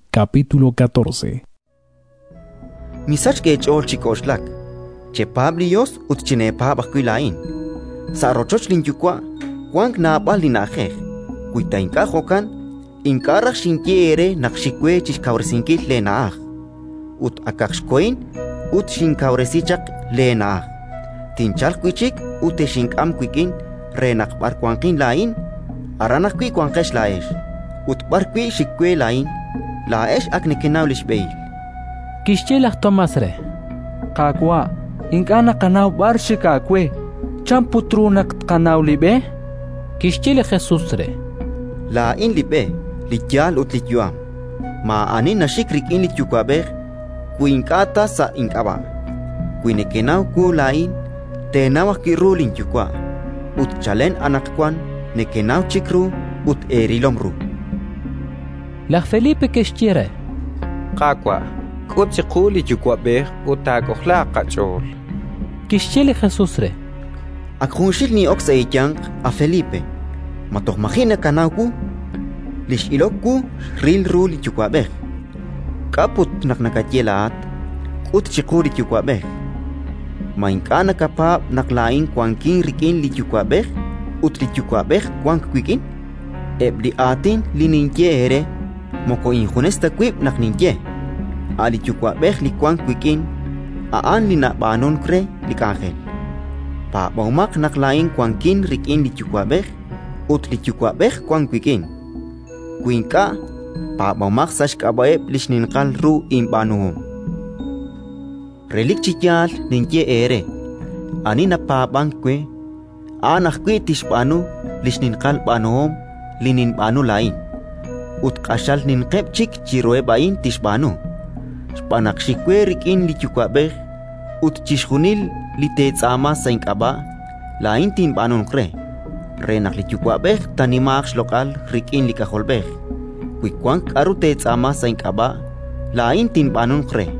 Kawaq eech'ool! “Misachk eech'ool chi k'oxlak. Chepaab' li Yos ut chineepaab' ajwi' laa'in. Sa' rochoch linYuwa' wank naab'al li na'ajej; wi ta ink'a' jo'kan, ink'a' raj xinye eere naq xik we chi xkawresinkil leena'aj. Ut akaq xkohin ut xinkawresi chaq leena'aj, tinchalq wi' chik ut texink'am wik'in re naq b'ar wanqin laa'in, aran ajwi' wanqex laa'ex. Ut b'ar wi' xik we laa'in, laa'ex ak nekenaw li xb'ehil”. Kixye laj Tomás re: —Qaawa', ink'a' naqanaw b'ar xik aawe. Chan put ru naq tqanaw li b'e? Kixye li Jesus re: —Laa'in li b'e, li yaal ut li yu'am. Maa'ani naxik rik'in li Yuwa'b'ej, wi ink'a' ta sa' ink'ab'a'. Wi nekenaw wu laa'in, teenaw ajwi' ru linYuwa'; ut chalen anaqwan nekenaw chik ru ut eerilom ru. Laj Felipe kixye re: —Qaawa', k'ut chiqu li Yuwa'b'ej ut taak'ojlaaq qach'ool. Kixye li Jesus re: —Ak junxil nin'ok sa' eeyanq, a Felipe. Ma toj maji' nakanaw wu? Li x'ilok wu, xril ru li Yuwa'b'ej. K'a' put naq nakaye laa'at: «K'ut chiqu li Yuwa'b'ej»? Ma ink'a' nakapaab' naq laa'in wankin rik'in li Yuwa'b'ej ut li Yuwa'b'ej wank wik'in? Eb' li aatin li ninye eere, moko injunes ta wib' naq ninye; a' li Yuwa'b'ej li wank wik'in, a'an li nab'aanunk re li k'anjel. Paab'omaq naq laa'in wankin rik'in li Yuwa'b'ej ut li Yuwa'b'ej wank wik'in. Wi ink'a', paab'omaq sa' xk'ab'a'eb' li xninqal ru inb'aanuhom. Relik chi yaal ninye eere: ani napaab'ank we, a'an ajwi' tixb'aanu li xninqal b'aanuhom li ninb'aanu laa'in, ut q'axal ninqeb' chik chiruheb' a'in tixb'aanu, xb'aan naq xik we rik'in li Yuwa'b'ej. Ut chixjunil li teetz'aama sa' ink'ab'a', laa'in tinb'aanunq re, re naq li Yuwa'b'ej taanimaaq xloq'al rik'in li K'ajolb'ej. Wi wank k'aru teetz'aama sa' ink'ab'a', laa'in tinb'aanunq re.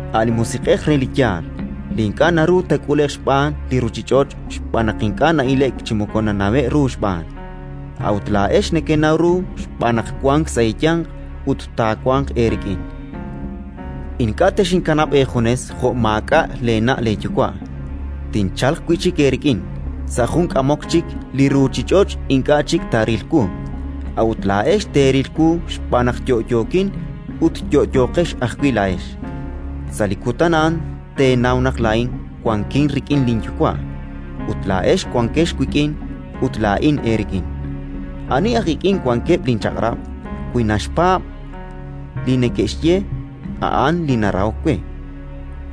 a' li Musiq'ej re li yaal, li ink'a' naru taak'ule'q xb'aan li ruuchich'och' xb'aan naq ink'a' na'ile'k chi moko nanawe'k ru xb'aan. A'ut laa'ex nekenaw ru xb'aan naq wank sa' eeyanq ut taawanq eerik'in. “Ink'a' texinkanab' eejunes jo' maak'a' leena' leeyuwa': tinchalq wi' chik eerik'in. Sa' jun k'amok chik li ruuchich'och' ink'a' chik taaril wu, a'ut laa'ex teeril wu xb'aan naq yo'yookin ut yo'yooqex ajwi' laa'ex. Sa' li kutan a'an teenaw naq laa'in wankin rik'in linYuwa', ut laa'ex wankex wik'in ut laa'in eerik'in. Ani aj ik'in wankeb' linchaq'rab', wi naxpaab' li neke'xye, a'an li narahok we.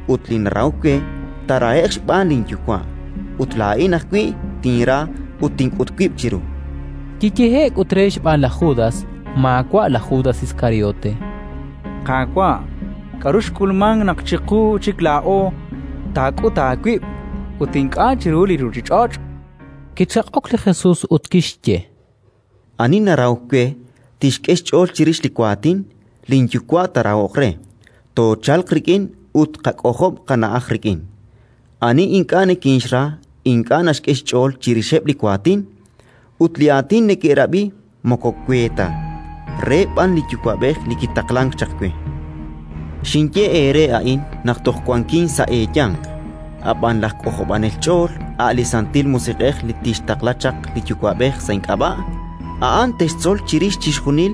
Ut li narahok we, taarahe'q xb'aan linYuwa'; ut laa'in ajwi' tinra ut tink'ut wib' chiru”. Kiyehe'k ut re xb'aan laj Judas (maawa' laj Judas Iskariote): —Qaawa', k'aru xk'ulmank naq chiqu chik laa'o taak'ut aawib' ut ink'a' chiru li ruuchich'och'? Kichaq'ok li Jesus ut kixye: —Ani narahok we, tixk'e xch'ool chirix li waatin; linYuwa' taarahoq re, toochalq rik'in ut tqak'ojob' qana'aj rik'in. Ani ink'a' nikinxra ink'a' naxk'e xch'ool chirixeb' li waatin, ut li aatin nekerab'i moko we ta, re b'an li Yuwa'b'ej li kitaqlank chaq we. “Xinye eere a'in naq toj wankin sa' eeyanq. Ab'an laj K'ojob'anel ch'ool, a' li Santil Musiq'ej li tixtaqla chaq li Yuwa'b'ej sa' ink'ab'a', a'an textzol chirix chixjunil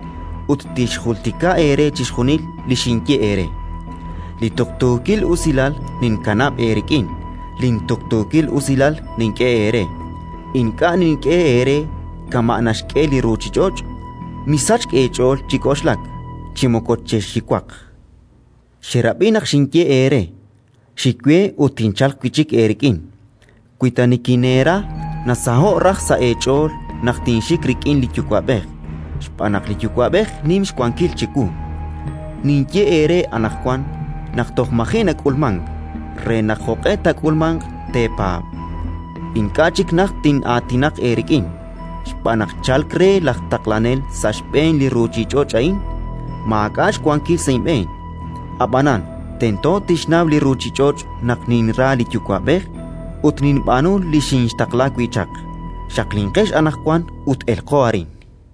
ut tixjultika eere chixjunil li xinye eere. “Li tuqtuukil usilal ninkanab' eerik'in, lintuqtuukil usilal nink'e eere; ink'a' nink'e eere kama' naxk'e li ruuchich'och'. Misachk eech'ool chi k'oxlak, chi moko chexxiwaq. Xerab'i naq xinye eere: «Xik we ut tinchalq wi' chik eerik'in». Wi ta nikineera, nasaho'k raj sa' eech'ool naq tinxik rik'in li Yuwa'b'ej, xb'aan naq li Yuwa'b'ej nim xwankil chiwu. Ninye eere anaqwan, naq toj maji' nak'ulmank, re naq, jo'q'e taak'ulmanq, teepaab'. “Ink'a' chik najt tin'aatinaq eerik'in, xb'aan naq chalk re laj Taqlanel sa' xb'een li ruuchich'och' a'in. Maak'a' xwankil sa' inb'een; ab'anan tento tixnaw li ruuchich'och' naq ninra li Yuwa'b'ej ut ninb'aanu li xinxtaqla wi' chaq. Xaqlinqex anaqwan ut elqo arin.